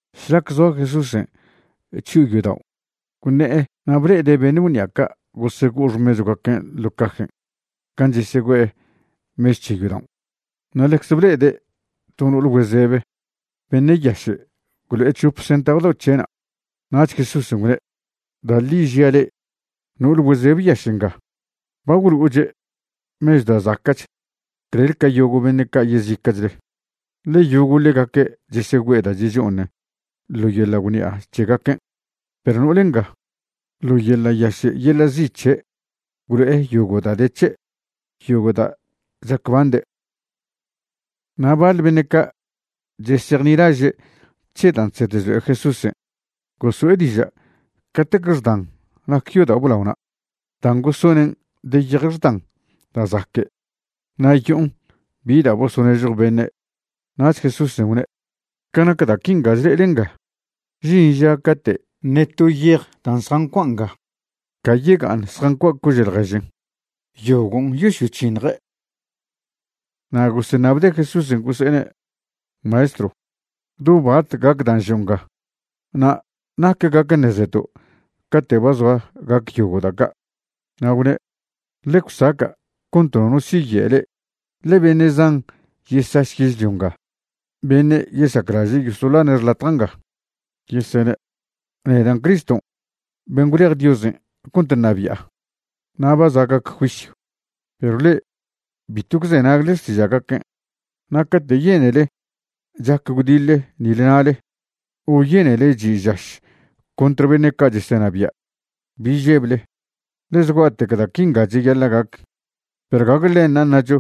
Šlac zoa Jesúsen' chyo'o yodao', gwṉe'e na' ble'ede' beṉe' gwṉi'a ca' gosego'o xmechwgaquen' ḻo' cajen' gan' chesegüe'e mechw c̱he yodaon'. Na' ḻecze ble'ede' to no'ol güezebe beṉe' yaše' gwlo'e c̱hop centav dao' c̱he'na'. Nach Jesúsen' gwne': ―Da' ḻi žia' le'e, no'ol güezebe yaše' nga ba gwlo'oche' mechw da' zaca'ch clel ca yogo' beṉe' ca' yezica'chle. Ḻe yogo' ḻegaque' chesegüe'e da' checho'oṉen ḻo yeḻa' gwṉi'a c̱hegaquen', perw no'ol nga, ḻo yeḻa' yaše' yeḻa' zi' c̱he' gwlo'e yogo' da' de c̱he', yogo' da' chacbande'. Na' baḻ beṉe' ca' chesejnilaže' c̱he dan' chsed chlo'e Jesúsen' goso'e diža' catec xdan nac yodao' blaona' dan' gosonen' de yej xdan da' zaque' na' yo'on bi da' bosonežjo beṉe'. Nach Jesúsen' gwne': ―Ca nac da' quinga chle'ele ngan', žin ža cate' ṉe to yej dan' zjancua' nga ca yega'aṉ zjancua' cože' ḻježen. Yogon' yosyoc̱hiṉje'. Na' goseṉabde' Jesúsen' gose'ene': ―Maestrw, ¿do bat gac dan' žo' nga? na' ¿nac gac ṉezeto' cate' ba zoa gac yogo' da' ca'? Na' gwne': ―Ḻe gwsaca' cont nono siye' le'e. Ḻe beṉe' zan yesaš yežlio nga beṉe' yesaclaže' yosoḻane' xḻatja' nga, yesene': “Nedan' Criston' ben' gwlej Diosen' cont ṉabi'a”, na': “Ba za' gac juisyw.” Perw le'e bitw gwzenagle xtiža'gaquen'. Na' cate' yenele chac gwdiḻe nile na'le o yenele chi' žaš contr beṉe' ca' chesenabia', bi žeble, ḻe zgua'tec da' quinga cheyaḻa' gac. Perw gague ḻenṉa' ṉacho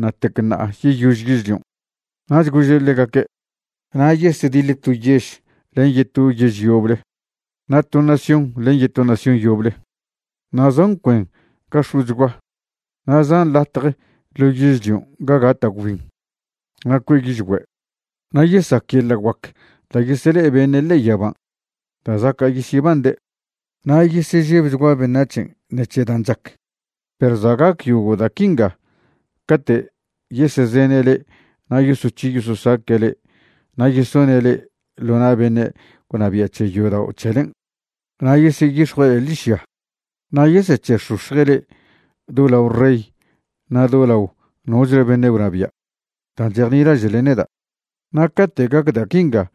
ṉa'tec ṉa'a yeyož yežlion'. Nach gože' ḻegaque': ―Na' yesediḻe to yež len yeto yež yoble na' to nación len yeto nación yoble, na' zan cuen ga x̱o'chgua na' zan latje ḻo yežlion' ga gata' gwbin na' cue' yižgüe', na' yesac yeḻa' guac da' yesele'e beṉe' ḻe'e yaban' da' zaca' yesyebande', na' yesežebchgua beṉac̱hen' ṉec̱he dan' chac. ’Perw za' gac yogo' da' quinga cate' yesezene' le'e na' yosoc̱hi yososaque' le'e na' yesone' le'e ḻo na' beṉe' gwnabia' c̱he yodao' c̱helen', na' yeseyix̱jue' le'e ḻižya. Na' yesec̱he'x̱ox̱je' le'e do lao rey na' do lao nochle beṉe' gwnabia' dan' chejnilaže'le neda'. Na' cate' gac da' quinga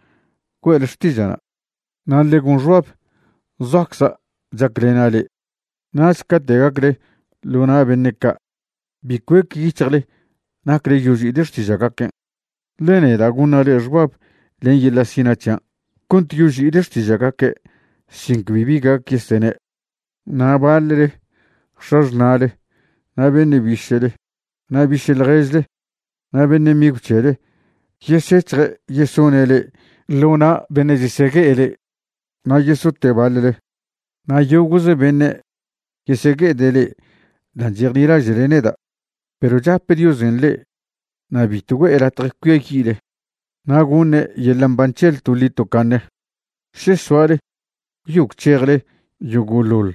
güe'le xtiža'na'. Na' ḻe gon xbab zoacza' chaclena' le'e, nach cate' gacle ḻo na' beṉe' ca' bi cuec yic̱hjle nacle yoži'ile xtiža'gaquen', ḻe neda' goṉa' le'e xbab len yeḻa' sina' c̱hian' cont yoži'ile xtiža'gaque' sin cbi bi gac yesene'. Na' baḻle x̱axṉa'le na' beṉe' biše'le na' biše' ḻježle na' beṉe' migw c̱hele yesec̱hje' yesone' le'e ḻo na' beṉe' chesegue'e le'e. Na' yesote' baḻle. Na' yogo'ze beṉe' yesegue'ede' le'e dan' chejnilaže'le neda'. Perw chape Diosen' le'e na' bitw güe'e latje cuiayi'le, na' goṉe' yeḻa' mban c̱hele toḻi tocaṉe še soale gwyo gwc̱hejle yogo'ḻoḻ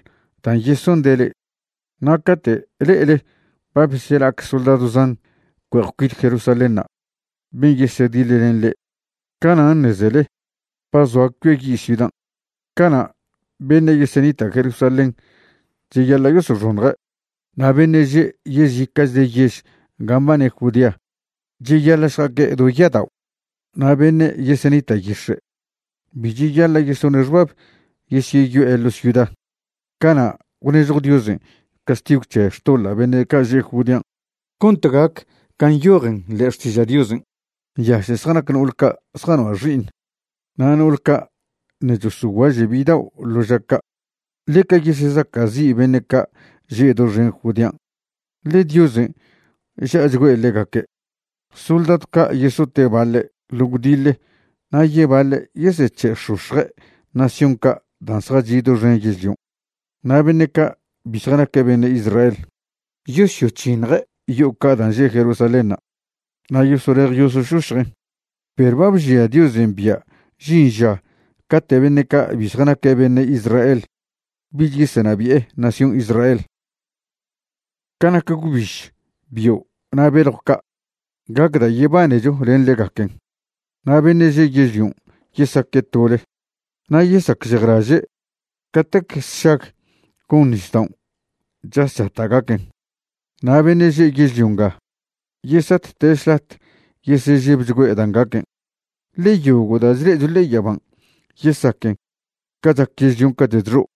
dan' yesonde' le'e. ’Na' cate' le'ele ba besela'ac soldadw zan cue'ej cuit Jerusalénṉa' ben' yesediḻlen le'e, canan' ṉezele ba zoa cuiayi' ciudan'. Cana' beṉe' yesenita' Jerusalén cheyaḻa' yosoxoṉje'. Na' beṉe' že' yezica'chle yež ga mbane Judea cheyaḻa' šja'aque' do ya'adao'. Na' beṉe' yesenita' yix̱e', bi cheyaḻa' yesone' xbab yesyeyo'e ḻo' ciuda. Cana' gwnežjo Diosen' castigw c̱he xtoḻa' beṉe' ca' že' Judean', cont gac can' nyojen ḻe'e Xtiža' Diosen'. ¡Nyaše' zjanac no'ol ca' zjanoa' xi'iṉ na' no'ol ca' ṉe' chosoguaže' bidao' ḻo ža ca'! Ḻeca yesesaca'zi' beṉe' ca' že' doxen Judean', ḻe Diosen' ža'achgüe' ḻegaque'. Soldadw ca' yesote' baḻe' ḻo gwdiḻe na' yebaḻe' yesec̱he'x̱ox̱je' nación ca' dan' zjachi' doxen yežlion'. Na' beṉe' ca' bi zjanaque' beṉe' Israel yosyoc̱hiṉje' yo'o ca' dan' že' Jerusalénṉa' na' yosolej yosošošjen'. Perw ba bžia' Diosen' bia' žin ža cate' beṉe' ca' bi zjanaque' beṉe' Israel bich yesenabi'e nación Israel. ’Ca nac gwbiž, bio' na' beljw ca', gac da' yebanecho len ḻegaquen. Na' beṉe' že' yežlion' yesaque' tole na' yesacžejlaže' catec sšag gon nisdaon' chas chata' gaquen. Na' beṉe' že' yežlio nga yesatte' šlat yesežebchgüe' dan' gaquen, ḻe yogo' da' chle'echo ḻe'e yaban' yesaquen ca chac yežlion' cate' chxo'.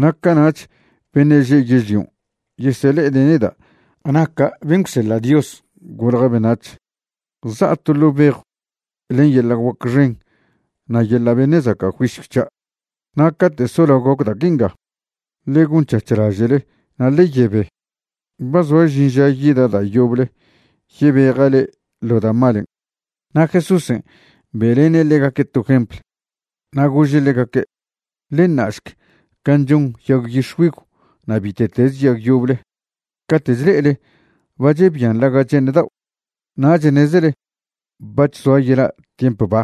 Na' cana'ch beṉe' že' yežlion' yesele'ede' neda' naca' ben' gwseḻa' Dios golja beṉac̱h, za'a to ḻo' bejw len yeḻa' guac xen na' yeḻa' beṉe' zaca' juisyw c̱hia'. Na' cate' solao gac da' quinga, ḻe gonc̱hac̱h laže'le na' ḻe yebe. Ba zoa žin ža yida' da' yoble yebeja' le'e ḻo da' malen'. Na' Jesúsen' be'lene' ḻegaque' to jempl, na' gože' ḻegaque': ―Ḻe ṉa'šc can' chon yag yix̱güigw na' bite'teze yag yoble, cate' chle'ele ba chebian ḻaga' che'eṉ dao' nach ṉezele bac̱h zoa yela' tiemp ba.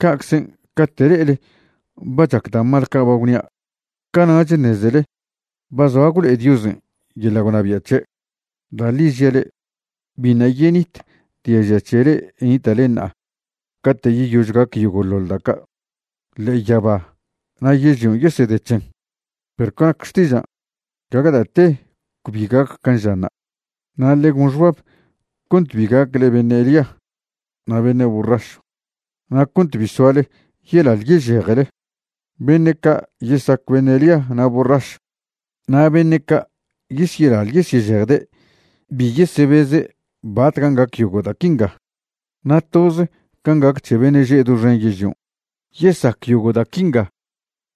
Ca'czen' cate' le'ele ba chac da' mal ca' ba gwnia', cana'ch ṉezele ba zoa gwlo'e Diosen' yeḻa' gwnabia' c̱he'. ’Da' ḻi žia' le'e, biṉa' yenit diaža' c̱he le'e nita'le ṉa'a cate' yeyož gac yogo'ḻoḻ da' ca'. Ḻe'e yaba na' yežlion' yesede c̱hen, perw ca nac xtižan', gague da' te cbi gac can' žanṉa'. ’Na' ḻe gon xbab cont bi gacle beṉe' lia na' beṉe' borrašw na' cont bi soale yelaḻ yežejele. Beṉe' ca' yesac beṉe' lia na' borrašw na' beṉe' ca' yesyelaḻ yesyežejde' bi yesebeze' batcan' gac yogo' da' quinga. Na' toz can' gac c̱he beṉe' že' doxen yežlion', yesac yogo' da' quinga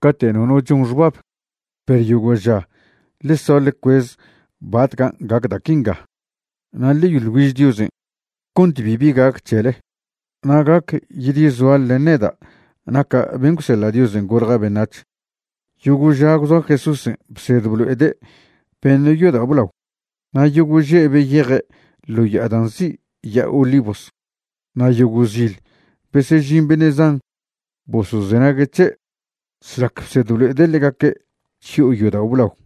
cate' nono chon xbab. Perw yogo' ža ḻe soa ḻe cuez batcan' gac da' quinga na' ḻe yoḻ güiž Diosen' cont bibi gac c̱hele na' gac yedyesoale len neda' naca' ben' gwseḻa' Diosen' golja' beṉac̱h. Yogo' ža gwzoa Jesúsen' bsed blo'ede' beṉe' yodao' blao, na' yogo' že' beyeje' ḻo ya'a da' nzi' Ya'a Olivos. Na' yogo' zil besežin beṉe' zan bosozenague' c̱he' šlac bsed blo'ede' ḻegaque' chyo'o yodao' blao.